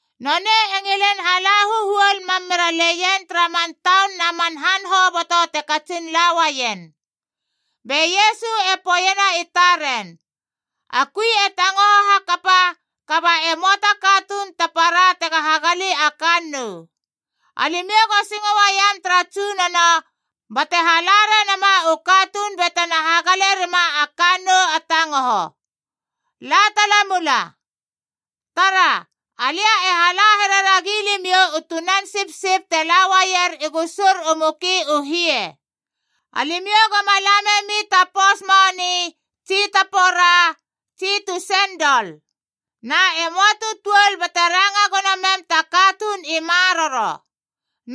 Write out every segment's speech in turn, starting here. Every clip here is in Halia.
Nonei e ngilin hala huhuol mam mera leien tara man taun na man han hoboto te katsin la uaien. Be Iesu e poeiena i taren, “A kui e tangoho hakapa kaba e möa ta katuun ta para tega hagali a kannou. Alimiou go singo uaiam tara Tsunono bate hala renama u katuun batena hagale rima a kannou a tangoho. La tala mula. Tara, alia e hala here ragi limiou u tunan sipsip te la uaier i gusur u muki u hie. Alimiou goma la memi ta pous moni tsi ta pora tsi tu sendol. Na e möa tu tuol bate ranga gono mem ta katuun i maroro.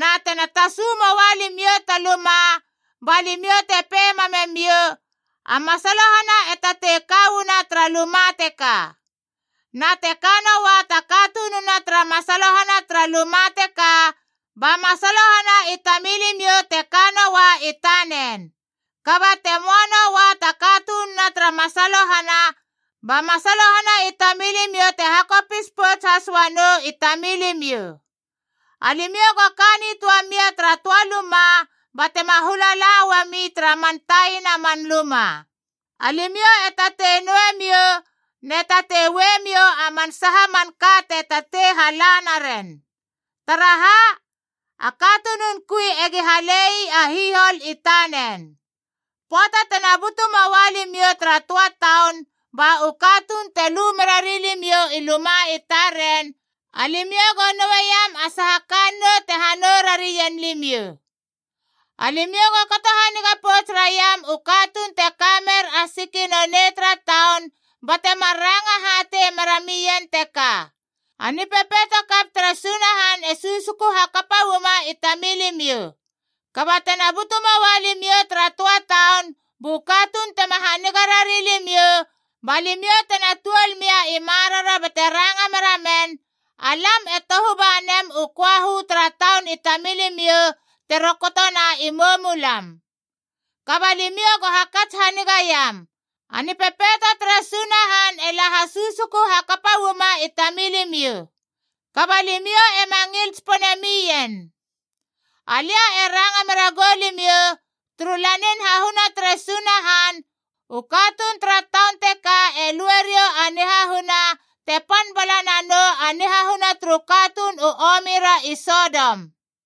Na tena tasu moa limiou ta luma, ba limiou te pei mamemiou, ‘A masalohana e tatei ka uana tara luma teka.’ Na te kanoa ta katununa tara masalohana tara luma teka, ba masalohana i tamilimiou te kanoa i tanen. Kaba te möa noa ta katununa tara masalohana, ba masalohana i tamilimiou te hakopis pouts has uanou i tamilimiou. Alimiou go ka nitöa mia tara töa luma batema hula la uami tara man taina man luma.b Alimiou e tatei noue miou ne tatei ue miou a man saha manka te tatei hala naren. Taraha? A katunun kui egi halei a hihol i tanen. Pöata tena butu moua limiou tara töa taun ba u katuun te lu mera rilimiou i luma i taren, alimiou go noueiam a saha kannou te hanou rarien limiou. Alimiou go kato haniga pouts raiam u katuun te ka mer a siki nonei tara taun, bate mar ranga hatei meramien teka, ‘A nipepeito kap tere Sunahan e susuku hakapa uama i tamilimiou.’ Kaba tena butu moa limiou tara töa taun bu katuun tema haniga rari limiou, ba limiou tena tuol mia i maroro bate ranga meramen, ‘Alam e tohu ba nem u köahu tara taun i tamilimiou te rokotona i moumulam! Kaba limiou go hakats haniga iam: a Nipepeito tere Sunahan e la hasusuku hakapa uama i tamilimiou, kaba limiou ema ngil tsipone mien!’ Alia e ranga mera goulimiou, turu lanin hahuna tere Sunahan, u katuun tara taun teka e lue riou a nihahuna te pan bala nanou a nihahuna turu katuun u omi ra i Sodom.”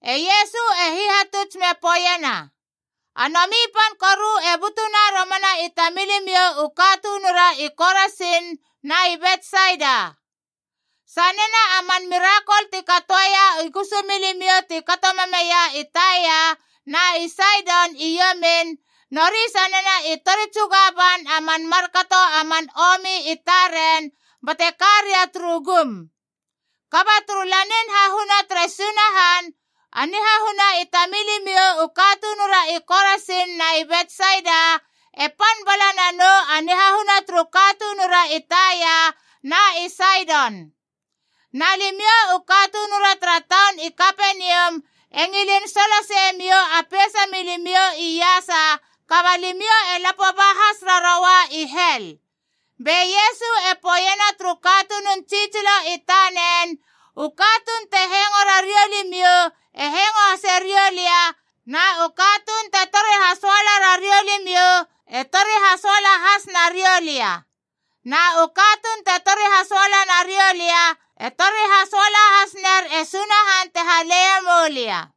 E Iesu e hihatuts me poeiena, “A nomi pan koru e butuna romana i tamilimiou u katunura i Korasin na i Betsaida! Sanena a man mirakol ti katoeia i gusumilimiou ti kato mameia i Taia na i Saidon i iomin, nori sanena i tori tsuga ban a man markato a man omi i taren bate ka ria turu gum. Kaba turu lanin hahuna tere Sunahan, a nihahuna i tamilimiou u katunura i Korasin na i Betsaida e pan bala nanou a nihahuna turu katunura i Taia na i Saidon. Na limiou u katunura tara taun i Kapenium e ngilin soloseie miou a peisa milimiou iasa, kaba limiou e lapo ba has raroua i hel!” Be Iesu e poeiena turu katunun tsitsilo i tanen, “U katuun te hengo rariou limiou e hengo hase riou lia, na u katuun te tori hasoala rariou limiou e tori hasoala has nariou lia. Na u katuun te tori hasoala narioulia e tori hasoala has ner e Sunahan te haleie moulia.”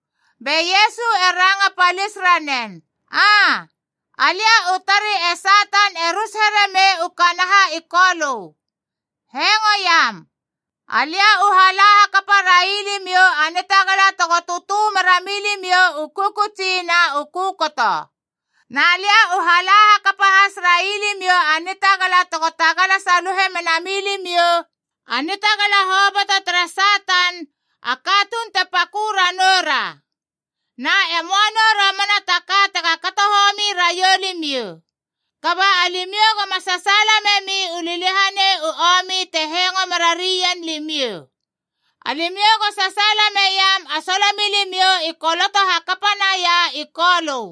Be Iesu e ranga palis ranen, “Aa, alia u tari e Satan e rus here mei u kanaha i Kolö. Hengoiam! Alia u hala hakapa railimiou a nitagala tego tötö mera milimiou u kökötsi na u kökoto. Na lia u hala hakapa has railimiou a nitagala tego tagala saluhe mena milimiou a nitagala hoboto tere Satan, a katuun te pakö ranou ra. Na e möa nou romana ta ka tega kato homi raiou limiou. Kaba alimiou goma sasaala memi u liliahanei u omi te hengo mera ri ien limiou. Alimiou go sasaala meiam a solomilimiou i koloto hakapa naia i Kolö.”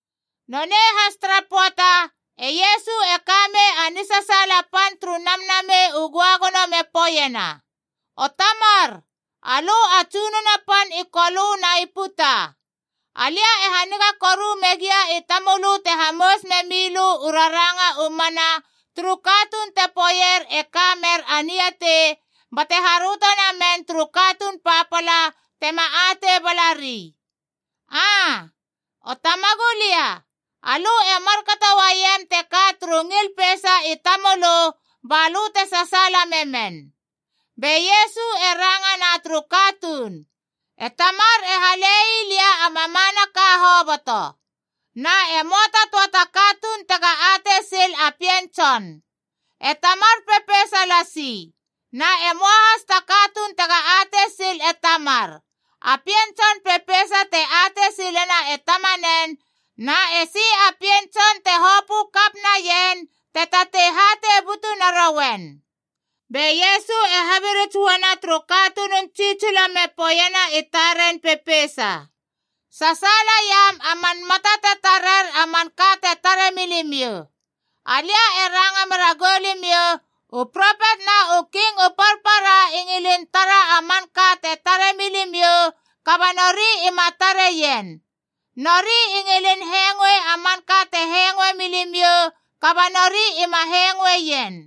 Nonei has tara pöata, e Iesu e ka mei a nisasaala pan turu Namnamei u Göagono me poeiena, “O Tamar, alö a Tsunono pan i Kolö na i puta! Alia e haniga koru megia i tamölö te hamous me milö u raranga u mana turu katuun te poeier e ka mer a niatei, bate haröto namen turu katuun papala tema atei balari. Aa, O Tamagulia, alö e markato uaiem teka turu ngil peisa i tamölö balö te sasaala memen.” Be Iesu e rangana turu katuun, “E Tamar e hale ii lia a mamanaka hoboto. Na e möa ta töa ta katuun tega atei sil a Pien Tson. E Tamar pepeisa lasi. Na e möa has ta katuun tega atei sil e Tamar. A Pien Tson pepeisa te atei silena e Tamanen, na esi a Pien Tson te hopö kap naien te tatei hatei butu narouen.” Be Iesu e habirits uana turu katunun tsitsilo me poeiena i taren pepeisa, “Sasaalaiam a man mata te tarer a manka te tare milimiou! Alia e ranga mera goulimiou, u propet na u king u parpara i ngilin tara a manka te tare milimiou, kaba nori ima tareien. Nori i ngilin hengoe a manka te hengoe milimiou, kaba nori ima hengoeien.”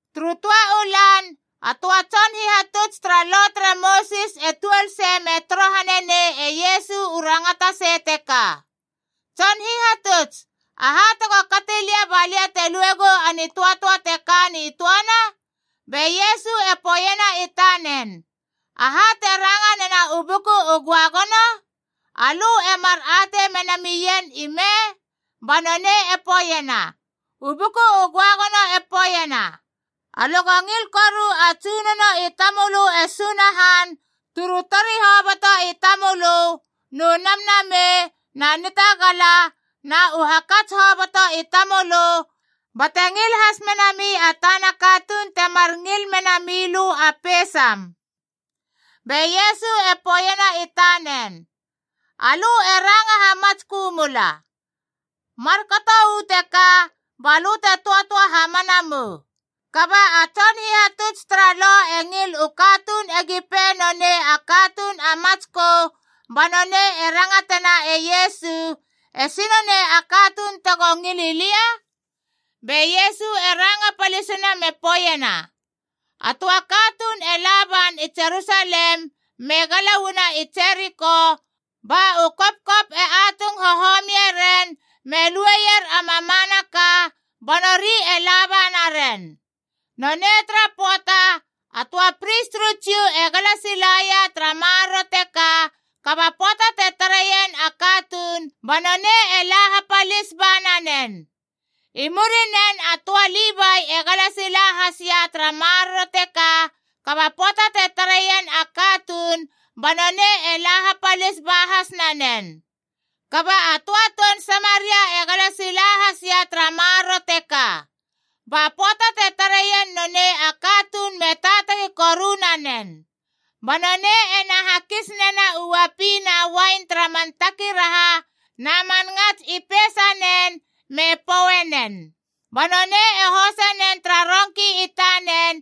Turu töa u lan, a töa tson hihatuts tara Lo tere Mosis e tuol sei me torohane nei e Iesu u rangatasei teka, “Tson Hihatuts, aha tego kati lia ba lia te luegou a nitöatöa te ka nitöana?” Be Iesu e poeiena i tanen, “Aha te ranga nena u Buku u Göagono? Alö e mar atei mena mien ime?” Ba nonei e poeiena, “U Buku u Göagono e poeiena, ‘Alö go ngil koru a Tsunono i tamölö e Sunahan turu tori hoboto i tamölö nu namnamei na nitagala na u hakats hoboto i tamölö, bate ngil has menami a tana katuun temar ngil mena milö a peisam.’” Be Iesu e poeiena i tanen, “Alö e ranga hamatskö mula. Markato uu teka ba lö te töatöa hamana mou.” Kaba a tson hihatuts tara Lo e ngil u katuun egi pei nonei a katuun a matskö, ba nonei e rangatena e Iesu, “Esi nonei a katuun tego ngili lia?” Be Iesu e ranga palisina me poeiena, “A töa katuun e la ban i Jerusalem me gala uana i Jeriko, ba u kopkop e atung hohomie ren me lueier a mamanaka, ba nori e laba naren. Nonei tara pöata, a töa pris turu Jiu e gala silaia tara maroro teka, kaba pöata te tareien a katuun ba nonei e la hapalis ba nanen. I murinen a töa Livai e gala sila hasia tara maroro teka, kaba pöata te tareien a katuun ba nonei e la hapalis ba has nanen. Kaba a töa toun Samaria e gala sila hasia tara maroro teka. Ba pöata te tareien nonei a katuun me taatagi koru nanen. Ba nonei ena hakis nena u uapi na uain tara man takiraha na man ngats i peisanen, me pouenen. Ba nonei e hose nen tara rongki i tanen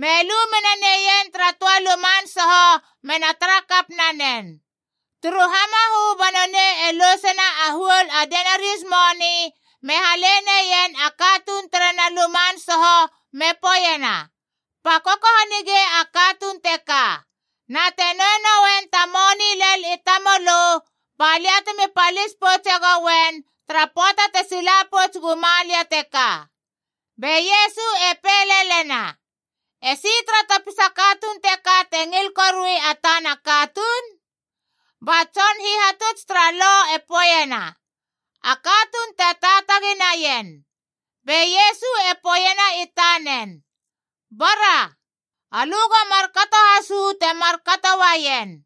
me lu mena neien tara töa luman soho mena tara kap nanen. Turu hamahö ba nonei e lousena a huol a denarius moni me hale neien a katuun terena luman soho me poeiena, ‘Pakoko hanigei a katuun teka. Na te noue noen ta moni lel i tamölö, ba lia temi palis poutse gouen tara pöata te sila pouts guma lia teka.’” Be Iesu e pei lelena, “Esi tara topisa katuun teka te ngil korui a tana katuun?” Ba tson hihatuts tara Lo e poeiena, “A katuun te taatagi naien.” Be Iesu e poeiena i tanen, “Bara. Alö go markato has uu te mar kato uaien.”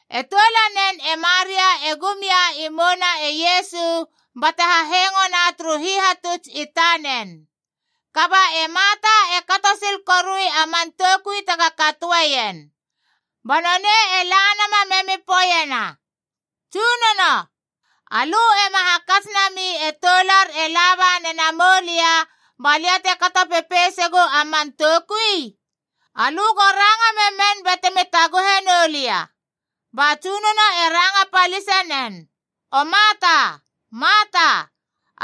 E toulanen e Maria e gum ia i mouna e Iesu bate hahengona turu hihatuts i tanen. Kaba e Marta e kato sil korui a man toukui tega katoeien. Ba nonei e la nama memi poeiena, “Tsunono, alö ema hakats nami e toular e laba nena moulia ba lia te kato pepeisegu a man toukui? Alö go ranga memen bate mi taguhe noulia!” Ba Tsunono e ranga palise nen, “O Marta, Marta!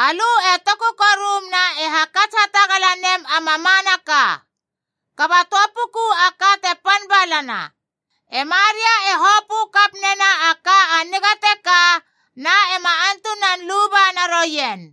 Alö e toku korum na e hakats hatagala nem a mamanaka. Kaba töa puku a ka te pan balana. E Maria e hopö kap nena a ka a niga teka, na ema antunan luba naroien.”